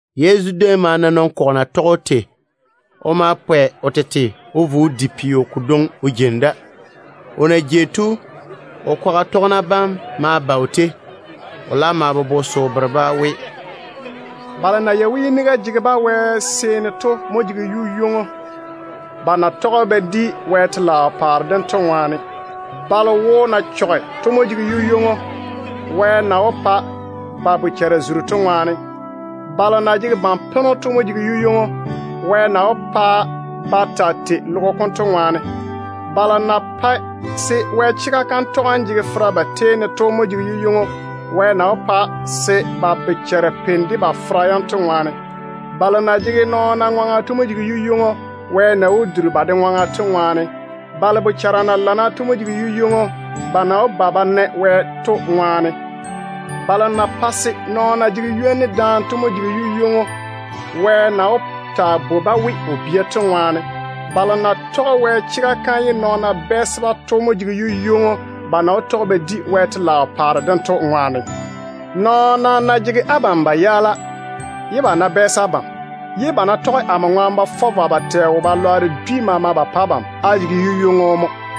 Yezu déem ma na nɔn-kɔgɔ na tɔge‑o tei. O ma pwɛ o tete o vo o di peo kodwoŋi o jeini da. O na jei to, o kwaga tɔgena bam ma vo o tei. O laam ma bobo se o bere-ba we: “Balo na yei we yiniga jege-ba Wɛ seeni to mo jege yu-ywoŋo, ba na tɔge ba di Wɛ telaao paare dem to ŋwaane. Balo wo na chɔge to mo jege yu-ywoŋo, Wɛ na wó pa ba bochara zuri to ŋwaane. Balo na tu ba tete to mo jege yu-ywoŋo, Wɛ na wó pa ba taa tei logo kom baŋa to ŋwaane. Balo na pae se Wɛ chega kam tɔgem jege fera ba tei ne to mo jege yu-ywoŋo, Wɛ na wó pa se ba bochara peini de ba fera yam to ŋwaane. Balo na jege nɔɔna ŋwaŋa to mo jege yu-ywoŋo, Wɛ na wó duri ba de ŋwaŋa to ŋwaane. Balo bochara na lana fase to mo jege yu-ywoŋo, ba na wó ba ba na Wɛ to ŋwaane. Balo na pae se nɔɔna jege ywoni daane to mo jege yu-ywoŋo, Wɛ na wó taa bwoi-ba we, o tete bia to ŋwaane. Balo na tɔge Wɛ chega kam ye nɔɔna bɛɛse-ba to mo jege yu-ywoŋo, ba na wó tɔge ba di Wɛ telaao paare dem to ŋwaane. Nɔɔna ná twe abam ye ba bɛɛse abam, ye ba ta ná tɔge amo ŋwaane ba fɔ vwa dwi maama ba pa abam, á jege yu-ywoŋo mo.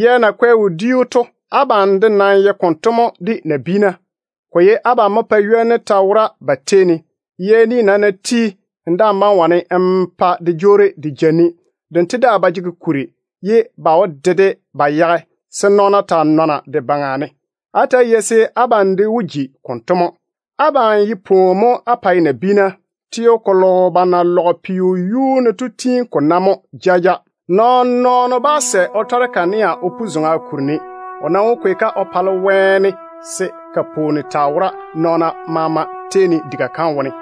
Yɛ na kwɛ wodiu tei to, abam de nam ye konto mo de nabiina. Ko ye abam mo pae ywoni wora ba tei ne. Yɛ ni nam ná ti, n daa‑n bá‑n wane n pa de jwoori de ja ni. Dento daa ba jege kuri. Ba nam wó dole-de ba yage, se nɔɔna taa nɔne de baŋa ne. Abam nye ne pwooni mo á pae nabiina. Teo kolo ba na lɔge peo yuu ne to tiini ko nae mo jaja. Nɔɔn-nɔɔno bá sɛ o tɔre min-zwoŋo o pu zoŋa kuri ne. O nam wó kwei-ko o zege wɛyuu ne, se ko pwooni taa wora nɔɔna maama tei ne diga kam wone.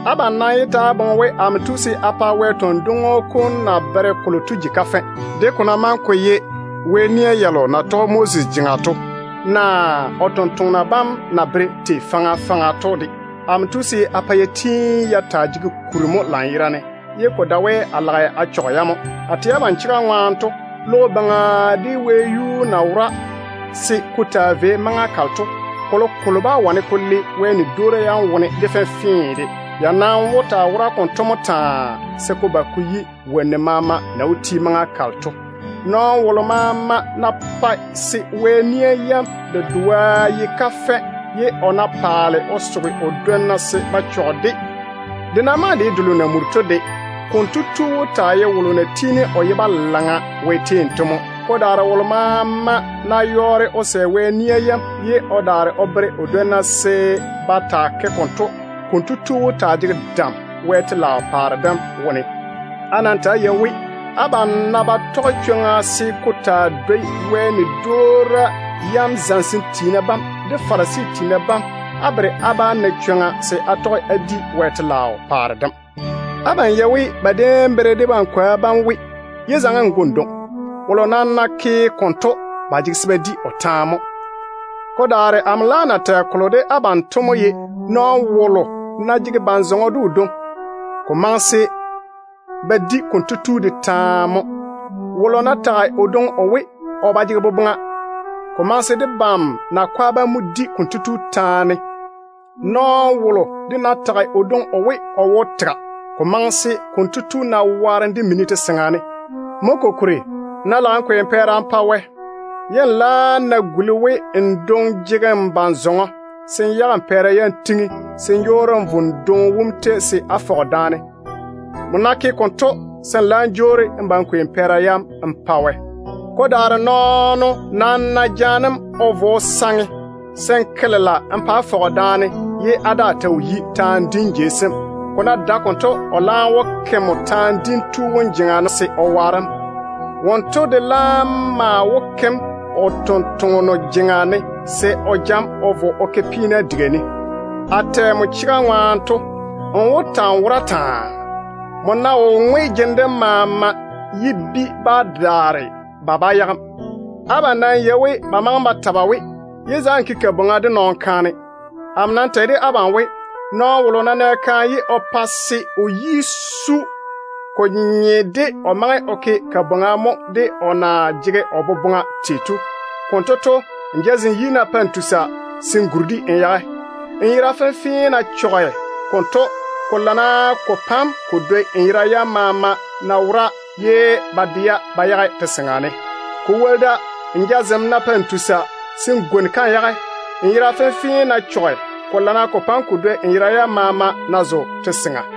Abam nam yé ta‑á boŋe we amo tu se a pa Wɛ tɔn-dwoŋo kom na bere kolo to ji kafɛ, de ko ná maŋe ko ye Wɛ nia yalo na tɔge Moses jeŋa to, naa o sampwori sem na bere tei faŋa faŋa to de. Amo tu se a pa ya tiini ya taa jege kuri mo lanyerane, ye ko dae we a lage a chɔge-ya mo. A tɛ abam chega ŋwaane to, logo baŋa de wɛyuu na wora se ko taa vei maŋa kalo to, kolokolo bá wane ko le Wɛ ni-dwoora yam wone de fenfee de. Ya nam wó taa wora konto mo taa, se ko ba ko yi wonnu maama na wó ti maŋa kalo to. Nɔɔno wolo maama ná pae se Wɛ nia yam dedoa ye kafɛ, ye o ná paale o soge o dwonna se ba chɔge-de, de ná maŋe de ye Wɛ ni delo na muri to de, konto tu wó taa ye wolo na tiini o ye balaŋa Wɛ tei ne mo. Ko daare wolo maama ná yɔɔre o sɛ Wɛ nia yam, ye o daare o bere o dwonna se ba de ke konto, konto tu wó taa jege dam Wɛ telaao paare dem wone. Á nam ta‑á yei we, abam ná ba tɔge chwoŋa se ko taa dwoi Wɛ nia zamesem tiina bam de Farisi tiina bam, á bere á bá na chwoŋa se á tɔge á di Wɛ telaao paare dem. Abam yei we ba déem bere debam kwoa bam we, ‘Yé zaŋe n go n dwoŋi. Wolo nam ná ke konto, ba jege se ba di o taane mo.’ Ko daare amo laam nam tɛ de abam we, nɔɔno wolo ná jege ban-zɔŋɔ de o dwoŋi, ko maŋe se ba di konto tu de taane mo. Wolo ná tage o dwoŋi o we, o ba jege boboŋa, ko maŋe se debam nakwa bam mo di konto tu taane. Nɔɔno wolo de ná tage o dwoŋi o we, o ye wo-koro, ko maŋe se konto tu na waarem de mini te-seŋa ne. Mo kokuri, nmo ná lage n kwei n pɛɛra n pa Wɛ, ye n laam ná guli we n dwoŋi jege n ban-zɔŋɔ, se n yage n pɛɛra yam n tiŋi, se n jwoori n vo n dwoŋi wom tei se á fɔge daane. Nmo ná ke konto, se n laam jwoori n ba n kwei n pɛɛra yam n pa Wɛ. Ko daare nɔɔno nam ná jaane‑m o vo o saŋe, se n ke lela n pa á fɔge daane ye á daa ta wo yi taane dim jei sem. Ko ná dae konto, o laam wó ke nmo taane dim tu wom jeŋa ne se o waare‑m. Wonto de laam maa wó ke‑m o tontoŋeno jeŋa ne se o ja‑m o vo o ke peena diga ne. A tɛ nmo chega ŋwaane to, nmo wó ta‑n wora taa. Nmo ná wo ŋwe jene dem maama ye bi ná daare, ba bá yage‑m. Abam nam yei we ba maŋe ba ta ba we, ‘Yé zaŋe n bwoori de nɔɔno kaane.’ Amo nam tɛ de abam we, nɔɔno wolo ná nɛ kaane ye o fera zo‑o, ko nye de kotu maŋe o ke bwoorim mo de o na jege o boboŋa tei to. Konto to, nmo jazem yi ná pae n tusa, se n chochɔrege-de n le n yage. Nmo yera fenfee ná chɔge konto, ko lana ko pa‑m ko dwoi n yera yam maama ná wora ye ba de-ya ba yage te-seŋa ne. Ko woli da, nmo jazem ná pae n tusa, se n gwoni-ka n yage. Nmo yera fenfee ná chɔge, ko lana ko pa‑m ko dwoi n yera yam maama ná zo te-seŋa ne.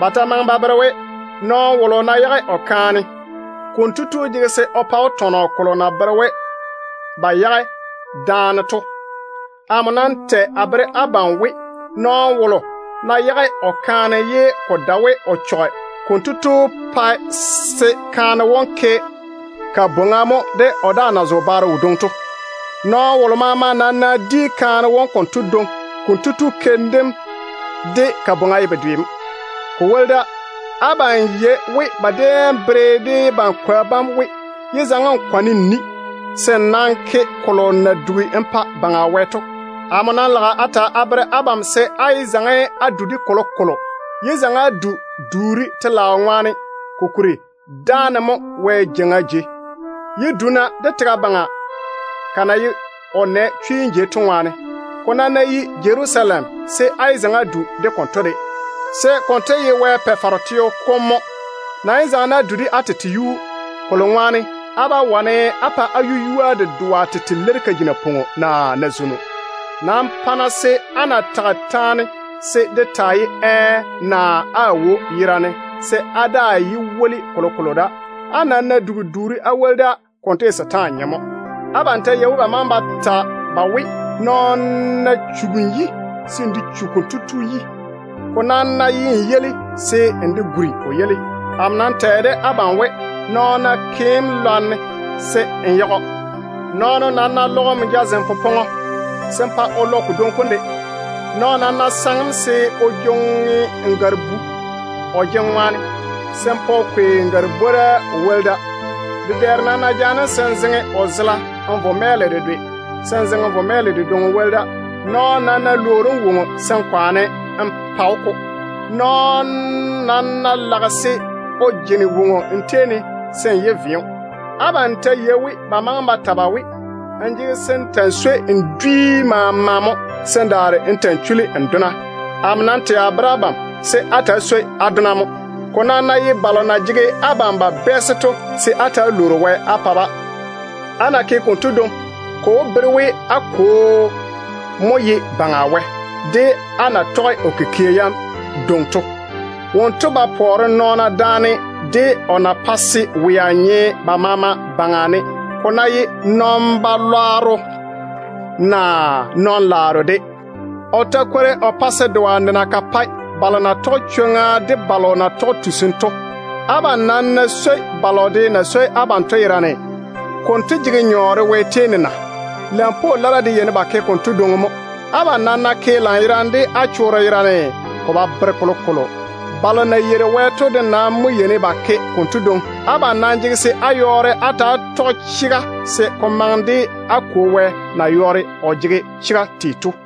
Ba ta maŋe ba ta ba we, ‘Nɔɔno wolo ná yage o kaane, kotu jege se o pa‑o tɔnɔ kolo na bere we ba yage daane to.’ Amo nam tɛ a bere abam we, nɔɔno wolo ná yage o kaane ye ko dae we o chɔge, kotu pae se kaane wom ke bwoŋa mo, ne o ná zo baro wodwoŋi. Nɔɔno wolo maama nam ná di kaane wom konto dwoŋi, konto tu keim dem de bwoŋa ye bedwe mo. Ko woli da, abam yei we ba déem bere debam kwoa bam we, ‘Yé zaŋe n kwane n ni. Nam ke kolo maama n na dugi n pa Baŋa Wɛ to.’ Amo nam lage a ta a bere abam se á yé zaŋe á du de kolokolo. Yé zaŋe á du duuri Wɛ telaao ŋwaane, kokuri dáane mo ye Wɛ jeiŋa jei. Yé du-na de tega baŋa de, ka na ye o nɛ chwiim jei to ŋwaane. Ko nam ná ye Jerusalem, se á yé zaŋe á du de konto de, se konto de ye Wɛ Pa-faro teo kom mo. Nam yé zaŋe á du de á tete yuu, kolo ŋwaane á bá wane á pa á yu-yua dedoa tete leiri ka ji napwoŋo naa nazwono. Nam pa-na se á ná tage taane, se de taa ye ‘ɛɛ’ naa ‘aawo’ yerane, se á daa yé woli kolokolo da. Á nam ná dugi duuri á woli da, konto ye setaane nyem mo. Abam ta yei we ba maŋe ba ta ba we, ‘Nɔɔno ná chugi n yi, se n de chu konto tu yi. Ko daa ná ye n yeili, se n de guri o yeili.’ Amo nam tɛ de abam we, nɔɔno ná ke‑m lwarem, se n yage‑o. Nɔɔno ná lɔge nmo jazem popɔŋɔ, se n pa o lɔ kodwoŋi kom de. Nɔɔno ta ná saŋe‑m se o jwoŋi n gare-bu o jene ŋwaane, se n pa o kwei n gare-bwora o woli da. Dedɛɛro nam ná jaane‑m se n zeŋe o zela n vo chwo-kukua laŋa ne, se n zeŋe n gaale dáane. Nɔɔno nam ná lwoori woŋo n tei ne, se n kwaane n pa-o-ko. Nɔɔno nam ná lage se o jene woŋo n tei ne, se n yé ve‑o. Abam ta yei we ba maŋe ba ta ba we, ‘N jege se n ta‑n swoi n fara maama mo, se n daare n ta‑n chuli n dona.’ Amo nam tɛ a bere abam, se á ta‑á swoi á dona mo. Ko nam ná ye balo na jege abam ba bɛɛse to, se á ta‑á lwoori Wɛ á pa-ba. Á ná ke konto, ko wó bere we á Kwo mo ye Baŋa Wɛ, de á na tɔge o kikia yam dwoŋi to. Wonto ba pɔɔre nɔɔna daane de o na pae se wea nye ba maama baŋa ne, ko ná ye nɔn-balwaaro naa nɔn-laaro de. O ta kwori o pae se doa nena ka pae balo na tɔge chwoŋa de balo na ywori to. Abam nam ná swoi balo de na swoi abam to yerane, konto jege nyɔɔre Wɛ tei ne na? Lampwoo lara de yeini ba ke konto dwoŋi mo. Abam nam ná ke lanyerane de á chorro yerane, ko ba bere kolokolo. Balo na yeiri Wɛ to de yeini ba ke konto dwoŋi mo. Abam nam jege se á yɔɔre á ta‑á tɔge chega, se ko maŋe de á Kwo Wɛ na yɔɔre o jege chega tei to mo.”